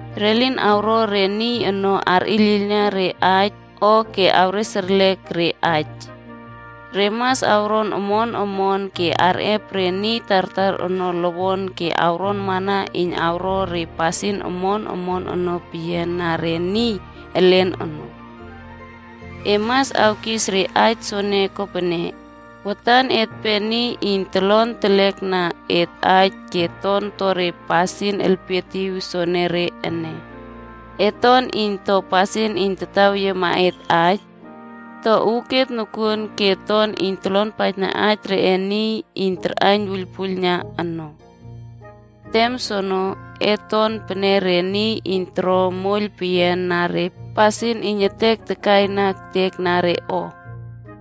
Re lin arꞌo re niy ono arꞌiylꞌiylna re aij o ke awres erlek re aij. Re mas awron omon omon ke arꞌep re niy tartar ono lowon ke awronmana iyn awro re pasin omon omon ono peyian na re niy elen ono. E mas awkis re aij soene kopene, watan etpe niy iyn tolon telekna et aij ke ton to re pasin elpietiw sopenere ene: Et ton iyn to pasin iyn tataweyiema et aij, to uuket nokuon ke ton iyn tolonpaijna aij reꞌe niy iyn karꞌaiyn wuiylpuiylna ono. Tem soono, et ton pene re niy iyn toro moiyl peyian na re pasin iyn etek takaina ektek na re o,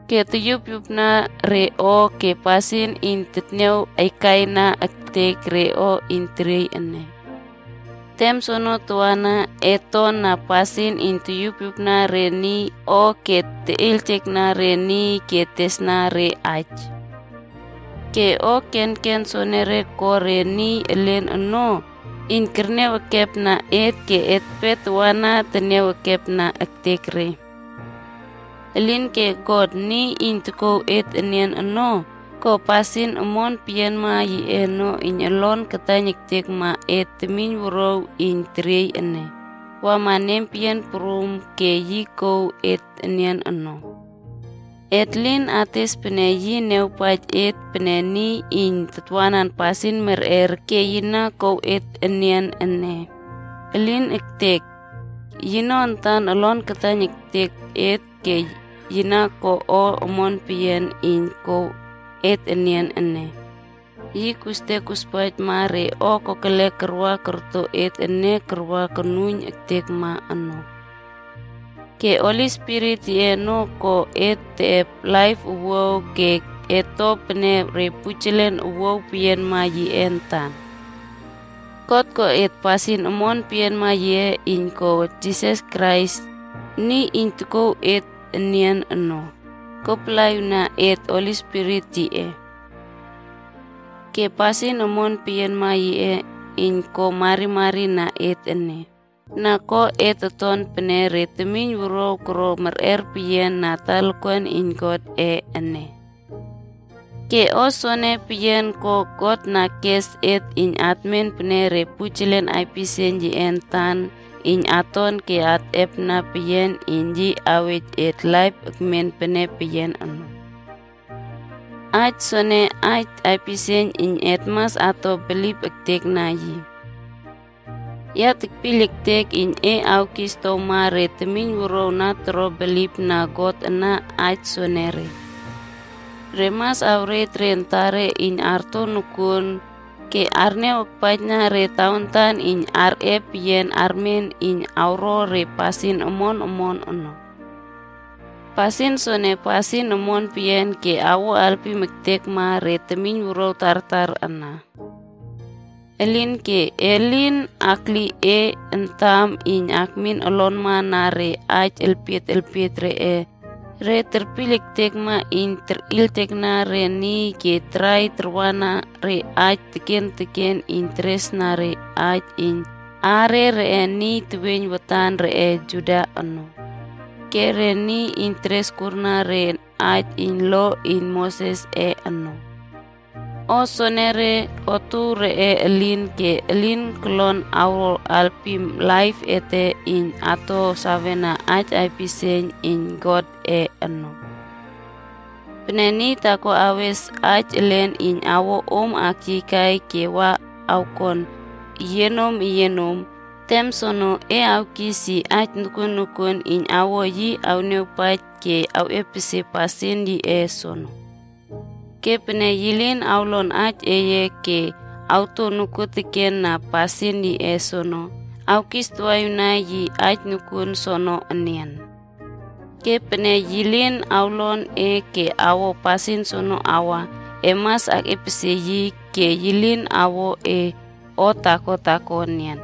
ke totyupyupna re o, ke pasin iyn tetniaw aikaina ektek re o iyn teriey ene. Tem soono tawana, et ton na pasin iyn toyupyupna re niy o ke teꞌeiyljekna re niy ke tesna re aij. Ke o kenken soenere ko re niy elen ono iyn kerniaw ekepna et ke etpe tawana teniaw ekepna ektek re. Elinke God, niy iyn tokouw et enian ono, ko pasin omon peyianma yiꞌe ono iyn olon taiyn ektekma et temiynwuruaw iyn teriey ene, wama nempeyian prum, ke yi kouw et enian ono. Et lin ates pene yi niawpaij et pene niy iyn tatwanan pasin merꞌer ke yi na kouw et enian ene. Elin ektek! Yino antan olon taiyn ektekma et ke yi na ko o omon peyian iyn kouw et enian ene. Yi kostek kospaijma re kokelek karꞌaw korto et ene kawa konuiyn ektekma ono. Ke Holi Spirit yiꞌe ono ko et teꞌep laip owuaw ke et to pene re pujelen owuaw peyianma yiꞌe antan. God ko et pasin omon peyianma yiꞌe iyn ko Jisas Krais, niy iyn tokouw et enian ono, kopalaꞌiwna et Holi Spirit yiꞌe. Ke pasin omon peyianma yiꞌe iyn ko marimari na et ene, na ko et oton pene re temiynwuruaw koro merꞌer peyian na talakuan iyn Godꞌe ene. Ke o soene peyian ko God na keꞌes et iyn atmen pene re pujelen aipisieiyn yiꞌe antan iyn aton ke atꞌepna peyian iyn yi awej et laip tekmen pene peyian ono. Aij soene aij aipisieiyn iyn et mas ato bilip ektekna yi. Ya tekpiyl ektek iyn e mas awkisoktow re temiynwuruaw na toro bilipna God ana aij soenere. Re mas awrej re antare iyn arto nokuon ke arniaw akpaijna re tawantan iyn arꞌe peyian armen iyn awro re pasin omon omon ono. Pasin soene, pasin omon peyian ke awo alpim ektekma re temiynwuruaw tartar ana. Elinke, e lin akli e antam iyn akmin olonma na re aij elpiet elpiet reꞌe niy terpiyl ektekma iyn terꞌeiyljekna re niy ke tarai tarwana re aij teken teken iyn teresna aij iyn aare reꞌe niy teweiyn watana reꞌe Juda ono, ke re niy iyn teres urkurna re aij iyn lo iyn Mosesꞌe ono. O soenere, otuow reꞌe elin ke elin kolon awro alpim laip ete iyn ato sawena aij aipisieiyn iyn Godꞌe ono. Pene niy taako awes aij elen iyn awo om akyiykai ke wa awkon eyienom eyienom, tem soene e awkis yi aij nokuoteken iyn awo yi awniawpaij ke awꞌepesie pasin yiꞌe soono. Ke pene yi lin awlon aij eye ke awto nokuotekena pasin yiꞌe soono, awkis tawaꞌiwna yi aij nokuon soono enian. Ke pene yi lin awlon e ke awo pasin soono awa, e mas akꞌiepesie yi ke e lin awkuo yi o taako taako enian.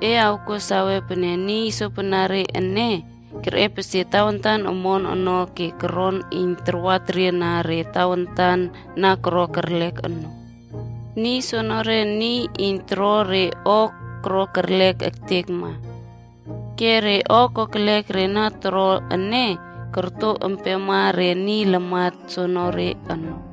E kuo sawe pene niy sopenere ene, kerꞌepesie tawantan omon ono ke koron iyn tarwa teriena re tawantan na koro kerlek ono. Niy soenere, niy iyn toro re o koro kerlek ektekma. Ke re o kokelek re na toro ene, korot empema re niy lamat soonore ono.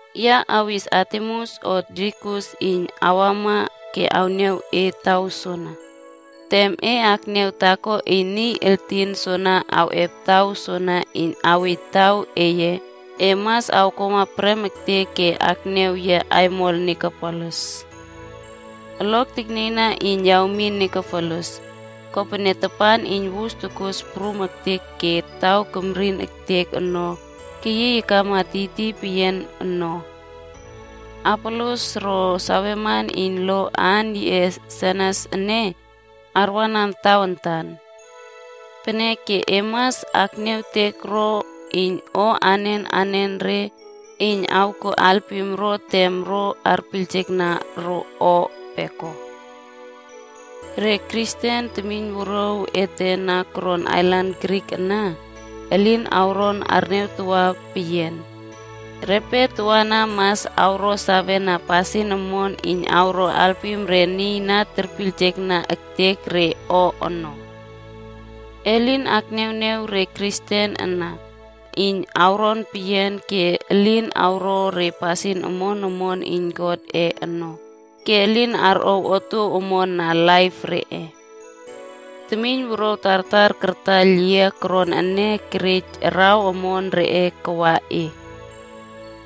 Ya awis Artemas o Tikikus iyn awama ke awniaw e taw soana. Tem e akniaw taako iyn niy entin soene awꞌep taw soana iyn awej taw eye, e mas awkuama prem ektek ke akniaw yia aimol Nikopolis. Olok teknieyna iyn ya awmin Nikapolis, kopene tapan iyn wus tokos prum ektek ke taw temrin ektek ono keyiy akama tiytiy peyian no. Apolos ro saweman iyn lo aan yiꞌe Senas ene, arwanan tawantan. Peneke e mas akniawtek ro iyn o anen anenre iyn awkuo alpim ro tem ro arpiylna ro o peko. Re Kristen temiynwuruaw ete na koron ailan Krit ana, elin awron arniawtawa peyian. Repe tawana mas awro sawena pasin omon iyn awro alpim re niy na terpiylna ektek re o ono. E lin akniawniaw re Kristen ana iyn awron peyian ke elin awro re pasin omon omon iyn Godꞌe ono ke elin arꞌow otuow omon na laip reꞌe. Temiynwuruaw tartar kartaiyl yia koron ene kerej araw omon reꞌe kawa e.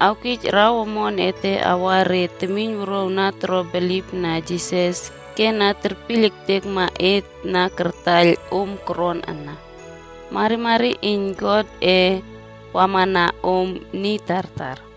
Awkij araw omon ete awa re temiynwuruaw na toro bilipna Jisas ke na terpiyl ektekma et na kartaiyl om koron ana. Marimari iyn Godꞌe awana om niy tartar.